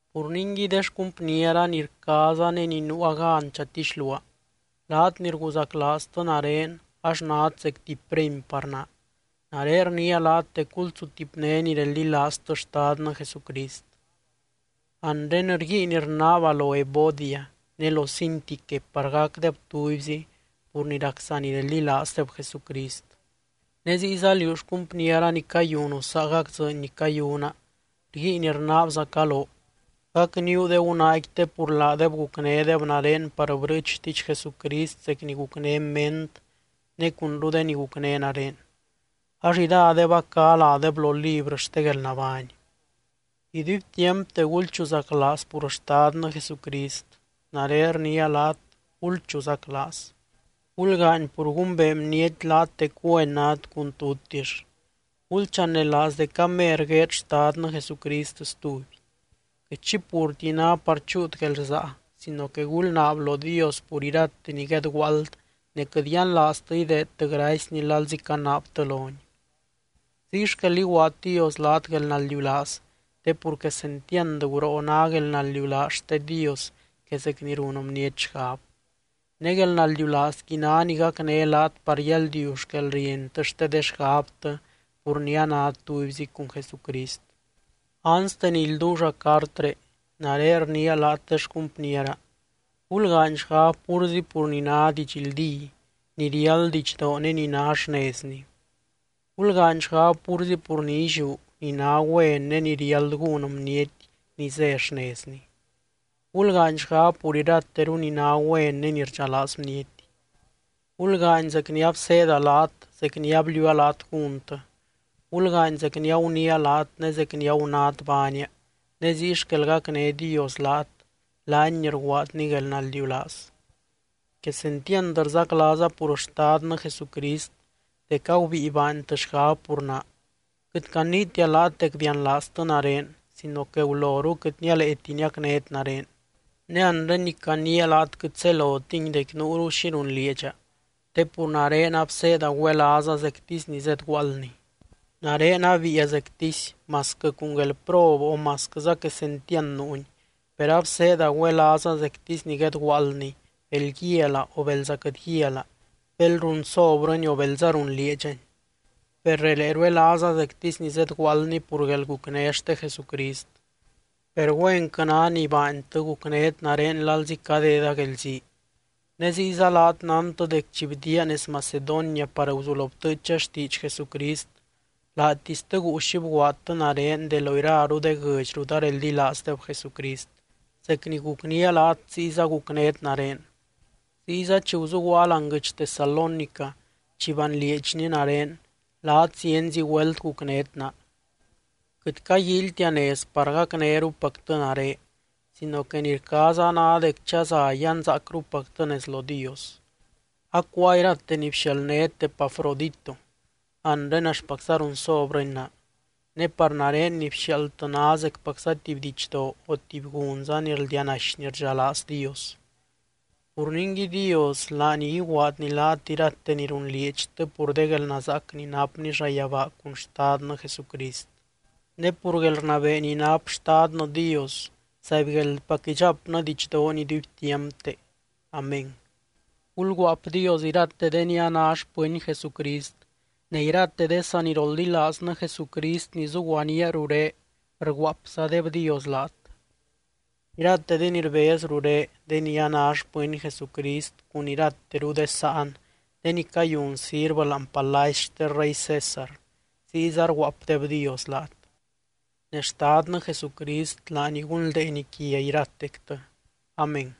Pur ningui, de xcumpniera ni rcaaza, ne ni nuua gan chatixluaa, laat ni rguzaclaaztɨ nare ax nát zec tuby premy par naa, nare rniia laat dec gulsutipné ni reldilaaztɨ Xtadnɨ Jesucrist. Anre, rguiin rnaaba lo Evodia ne lo Síntique par gacdeb tubyzi pur ni rac sanireldilaazdeb Jesucrist. Ne ziyza liú xcumpniera ni cayunu saagac dzɨɨny ni cayuna, rguiin rnaabzaca loo: gacníu de gunaaqui te pur laadeb gucnédeb nare par brɨɨch xtiidx Jesucrist zec ni gucné Ment ne cunru de ni gucné nare. Ax iradeb a cá ládeb lo librɨ xte guelnabány. Iduibtiampte gulchuzaclaaz pur Xtadnɨ Jesucrist. Nare rniia laat, ¡gulchuzaclaaz! Gulgaany pur gumbee bniety laat dec güen nát cun tutix. Gulchanelaaz dec amer gueed Xtadnɨ Jesucrist stuby. Quɨt xi purti ná par chúut guelrsaa sino que gulnaab lo Dios pur irate ni guedguaald ne quɨt yianlaaztɨ ideedtɨ gracyny lalzi canaabtɨ lony. Ziy xquel iguaad Dios laat guelnaldiulaaz te pur quesentiand guroo ná guelnaldiulaaz xte Dios que zec ni run bniety xgab. Ne guelnaldiulaazqui ná ni gacné laat par yaldiu xquelrientɨ xte de xgabtɨ pur ni anát tubyzi cun Jesucrist. Anste ni ilduulla cartré, nare rniia laat de xcumpniera: gulgaany xgab púrzi pur ni ná didxldí, ni riáld didxdoo ne ni ná xnezni. Gulgaany xgab púrzi pur ni illiú, ni ná güen ne ni riáld gún bniety ni zé xnezni. Gulgaany xgab pur irateru ni ná güen ne ni rdxalaaz bniety. Gulgaany zec ni abseeda laat zec ni abliuua laat gúntɨ. Gulgaany zec ni aguniia laat ne zec ni agunát baania ne ziy xquel gacné Dios laat, laany ni rguaadny guelnaldiulaaz. Quesentiand rzaclaaza pur Xtadnɨ Jesucrist dec agubíi baantɨ xgab pur naa. Quɨt caniitia laat dec bianlaaztɨ nare sino que guloru quɨt nialeeti niacnét nare. Ne anre ni caniia laat quɨt zelotingui dec nuuru xi runlieedxa te pur nare abseeda güelaaza zectisy ni zedguaaldni. Nare abiia zectisy, masquɨ cun guelprob o masquɨza quesentiand nuuni, per abseeda güelaaza zectisy ni guedguaaldni bel guialaa o belza quɨt guialaa, bel runsobrɨni o belza runlieedxani. Per relee ruelaaza zectisy ni zedguaaldni pur guelgucné xte Jesucrist. Per güenquɨ ná ni baantɨ, gucnét nare lalzi cadeda guelzii. Ne ziyza laat nántɨ dec chi bdiaa nez Macedonia par guzulo btɨɨcha xtiidx Jesucrist, laatistɨ guu xi bguaadtɨ nare de lo iraru de guɨdx rut areldilaazdeb Jesucrist, zec ni gucnía laat ziyza gucnét nare. Ziyza chi guzuguaa láani guɨdx Tesalónica chi banlieedxni nare, laat zienzi güelt gucnét naa. Quɨt caguíilytia nez par gacnérupactɨ nare sino que ni rcaaza ná dec chaza yanzaacrupactɨ nez lo Dios. Acuáa irate ni bxialdnét Epafrodito, anre axtpacza runsobrɨni naa. Ne par nare ni bxiaaldtɨ ná zecpacza tuby didxdoo o tuby gunza ni rldianaxy ni rdxalaaz Dios. Pur ningui Dios, laany iguaadny laat irate ni runlieedxtɨ pur de guelnazaac ni napny llayabaa cun Xtadnɨ Jesucrist. Ne pur guelrnabee ni nap Xtadnɨ Dios, ¡zaibgueldpac idxapnɨ didxdoony iduibtiampte! Amén. Gulguaapdios irate de ni a ná xpɨny Jesucrist. Ne irate de saniroldilaaznɨ Jesucrist ni zuguaníaa ruré, rguaapzadebdios laat. Irate de ni rbez ruré de ni a ná xpɨny Jesucrist cun irateru de sáan de ni cayun sirvɨ láani palacy xte Rey César, ziyza rguaapdebdios laat. Ne Xtadnɨ Jesucrist laany gunldeeny quia iratectɨ. Amén.